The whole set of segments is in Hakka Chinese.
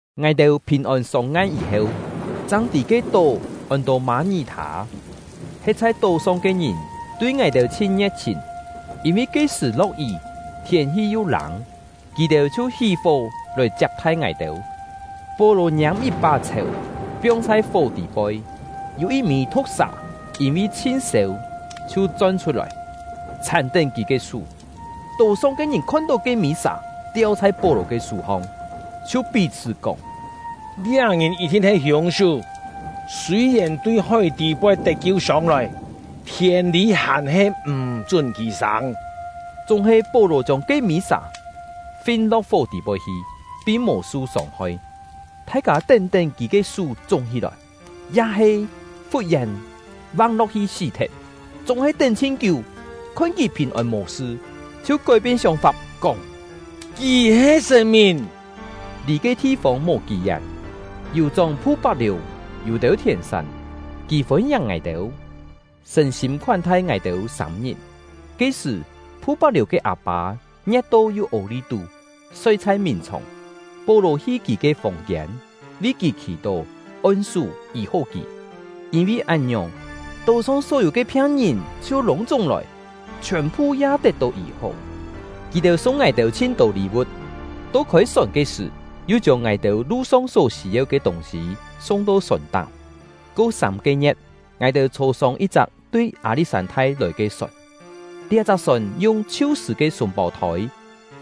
Ngài-têu phìn-ôn sông-ngan yî-heu, chang tî ke tó ôn-to Mâ-ngí-thâ. He̍t chhai tó-song ke ngìn tui ngài-têu chhin ngie̍t-chhìn. Yîn-vi ke-sṳ̀ lo̍k-yí, thiên-hi yu lâng, kì-têu chhiu hí-fó lòi chiap-thai ngài-têu. Pó-lò ngiâm yit-pá chhèu, piong chhai fó tî-poi. Yû yit-mî thu̍k-sà, yîn-vi chhin sêu chhiu chon-chhut-lòi, chhàn-tén kì ke sú. Tó-song ke ngìn khon-tó ke-mî sà tiau chhai Pó-lò ke sú-hong, chhiu pí-chhṳ́ kóng: “Liá ngìn yit-thin he hiûng-sú, sûi-yèn tui hói tî-poi tet-kiu sông-lòi, thiên-lî hàn-he m̀ chún kì sâng.” Chúng-he Pó-lò chiông ke-mî sà fin-lo̍k fó tî-poi hi, pin mò su sông-hoi. Thai-kâ tén-tén kì ke sú chúng-hí-lòi, ya-he fut-yèn vang-lo̍k-hi sí-thet; chúng-he tén chhin kiú, khon kì phìn-ôn mò-sṳ, chhiu kói-pien sióng-fap, kóng: “Kì he sṳ̀n-mìn!” Lì ke thi-fông mò kí-yén, yù-chóng Phu-pak-liù yû têu thièn-sán. Kì fôn-ngiàng ngài-têu, sṳ̀n-sîm khoán-thai ngài-têu sâm-ngit. Ke-sṳ̀, Phu-pak-liù ke â-pâ ngie̍t-tó yu ô-li-tú, soi chhai mìn-chhòng. Pó-lò hi kì ke fòng-kiên, vi kì khì-tó, on-sú, yî-hó kì. Yîn-vi án-ngiòng, tó-song só-yû ke phiang-ngìn chhiu lûng-chúng lòi, chhiòn-phu ya tet-tó yî-hó. Kì-têu sung ngài-têu chhin-tô lî-vu̍t; to khôi-sòn ke sṳ̀, yu chiông ngài-têu lu-song só sî-yeu ke tûng-sî sung-to sòn-táng. Ko sâm-ke ngie̍t, ngài-têu chhô-sông yit-chak tui Â-li̍t-sân-thai lòi ke sòn; liá-chak sòn yung “Chhiu-sṳ̂ ke Sûng-pâu-thôi”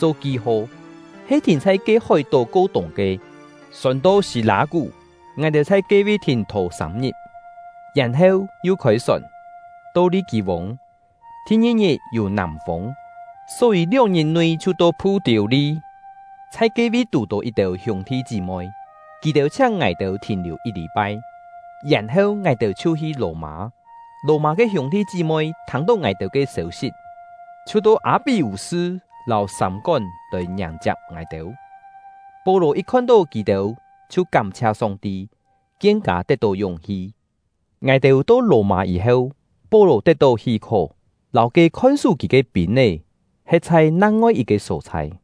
cho ki-ho, he thìn chhai ke hói-tó ko-tûng ke. Sòn to Si-lâ-kú, ngài-têu chhai ke-vi thìn-thò sâm-ngit, yèn-heu yu khôi-sòn, to Li-kî-vûng. Thi-ngi-ngit yû nàm-fûng, só-yî lióng-ngit nui chhiu to Phu-tiû-li, chhai ke-vi tù-tó yit-têu hiûng-thi chí-moi; kì-têu chhiáng ngài-têu thìn-liù yit lî-pai. Yèn-heu, ngài-têu chhiu hi Lò-mâ. Lò-mâ ke hiûng-thi chí-moi thâng-tó ngài-têu to ke sêu-sit, chhiu to Â-pí-vû-sṳ lâu Sâm-kón lòi ngiàng-chiap ngài-têu. Pó-lò yit khon-tó kì-têu chhiu kám-chhia Song-ti, kien-kâ tet-tó yúng-hi. Ngài-têu to Lò-mâ yî-heu, Pó-lò tet-tó hí-khó, lâu ke khon-sú kì ke pîn-é he̍t chhai nang-ngoi yit-ke só-chhai.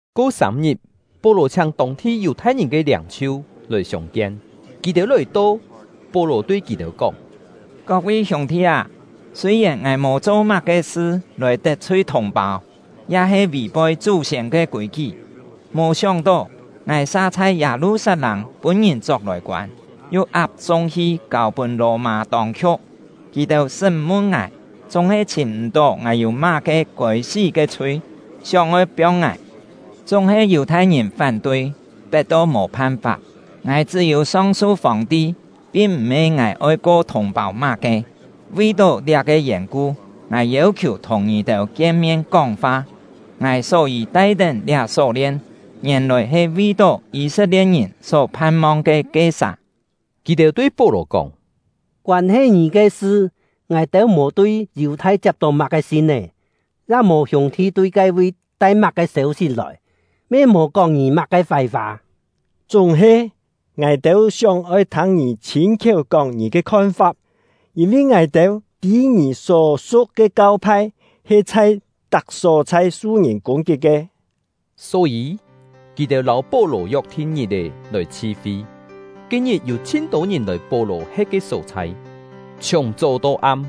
Ko sâm-ngit, Pó-lò chhiáng tông-thi Yù-thai-ngìn ke liâng-chhiu lòi siông-kien. Kì-têu lòi-to, Pó-lò tui kì-têu kóng: “Kok-vi hiûng-thi â, sûi-yèn ngài mò cho má-ke sṳ lòi tet-chhui thùng-pâu, ya-he vì-poi chú-siên ke kûi-kí, mò sióng-tó ngài sa chhai Yâ-lu-sat-lâng pûn-ngìn chok lòi koân, yu ap-sung hi kâu-pûn Lò-mâ tông-khiu̍k. Kì-têu sṳ́m-mun ngài, chúng-he chhìm m̀-tó ngài yû má-ke kôi-sí ke chhui, sióng-oi piong ngài. Chúng-he Yù-thai-ngìn fán-tui, pet-to mò phan-fap, ngài chṳ́-yû song-su Fòng-ti, pin m̀-he ngài oi ko thùng-pâu má-ke. Vi-tó liá-ke yèn-ku, ngài yêu-khiù thùng ngì-têu kien-mien kóng-fa. Ngài só-yî tai-tén liá só-lien, ngièn-lòi he vi-tó Yî-set-lie̍t-ngìn só phan-mong ke ke-sà.” Kì-têu tui Pó-lò kóng: “Koân-he ngì ke sṳ, ngài-têu mò tui Yù-thai chiap-tó má-ke sin-é, ya mò hiûng-thi tui ke-vi tai má-ke sêu-sit lòi, me mò kóng ngì má-ke fái-fa. Chúng-he, ngài-têu sióng-oi thâng ngì chhîn-khiéu kóng ngì ke khon-fap, yîn-vi ngài-têu tî ngì só su̍k ke kau-phai he chhai tak só-chhai su-ngìn kûng-kit ke.” Só-yî, kì-têu lâu Pó-lò yok-thin ngit-è lòi chhi-fi. Ke-ngit yû chhin-tô ngìn lòi Pó-lò he̍t ke só-chhai; chhiùng chó to am,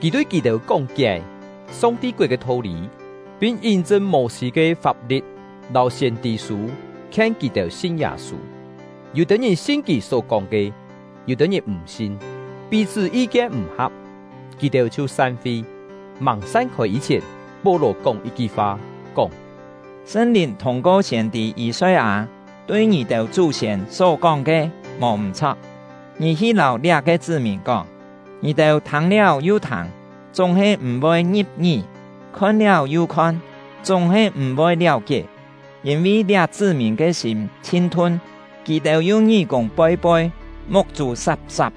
kì tui kì-têu kóng-kié Song-ti koet ke tho-lî, pin yín-chṳn Mô-sî ke fap-li̍t lâu siên-tî-sû, khien kì-têu sin Yâ-sû. Yû-têu ngìn sin kì só-kóng ke, yû-têu ngìn m̀ sin. Pí-chhṳ́ yi-kien m̀ ha̍p, kì-têu chhiu san-fi. Màng san-khôi yî-chhièn, Pó-lò kóng yit-ki fa, kóng: “Sṳn-Lìn thûng-ko siên-tî Yî-soi-â tui ngì-têu chú-siên só-kóng ke mò m̀-chho̍k! Ngì hi lâu liá-ke chṳ́-mìn kóng: Ngì-têu thâng-liáu yu thâng, chúng-he m̀-voi ngi̍p-ngí; khon-liáu yu khon, chúng-he m̀-voi liáu-kié. Yîn-vi liá chṳ́-mìn ke sîm chhin-thun; kì-têu yu ngí-kûng poi-poi, muk-chû sap-sap.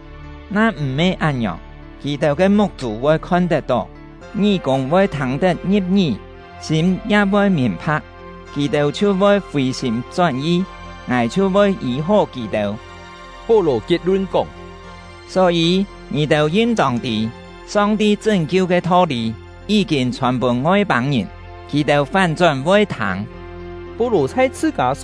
Na m̀-he án-ngiòng, kì-têu ke muk-chû voi khon-tet-tó, ngí-kûng voi thâng-tet ngi̍p-ngí, sîm ya voi mìn-pha̍k, kì-têu chhiu voi fì-sîm chón-yi, Ngài chhiu voi yî-hó kì-têu.” Pó-lò kiet-lun kóng: “Só-yî, ngì-têu yin-tông tî, Song-ti chṳ́n-kiu ke tho-lî yí-kîn chhòn-pûn Ngoi-pâng-ngìn; kì-têu fán-chón voi thâng!” Yû-têu kú-kién kâ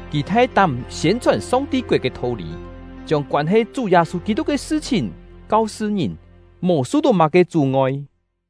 Kì thai-tám siên-chhòn Song-ti koet ke tho-lî, chiông koân-he Chú Yâ-sû Kî-tuk ke sṳ-chhìn kau-sṳ ngìn, mò su-tó má-ke chú-ngoi.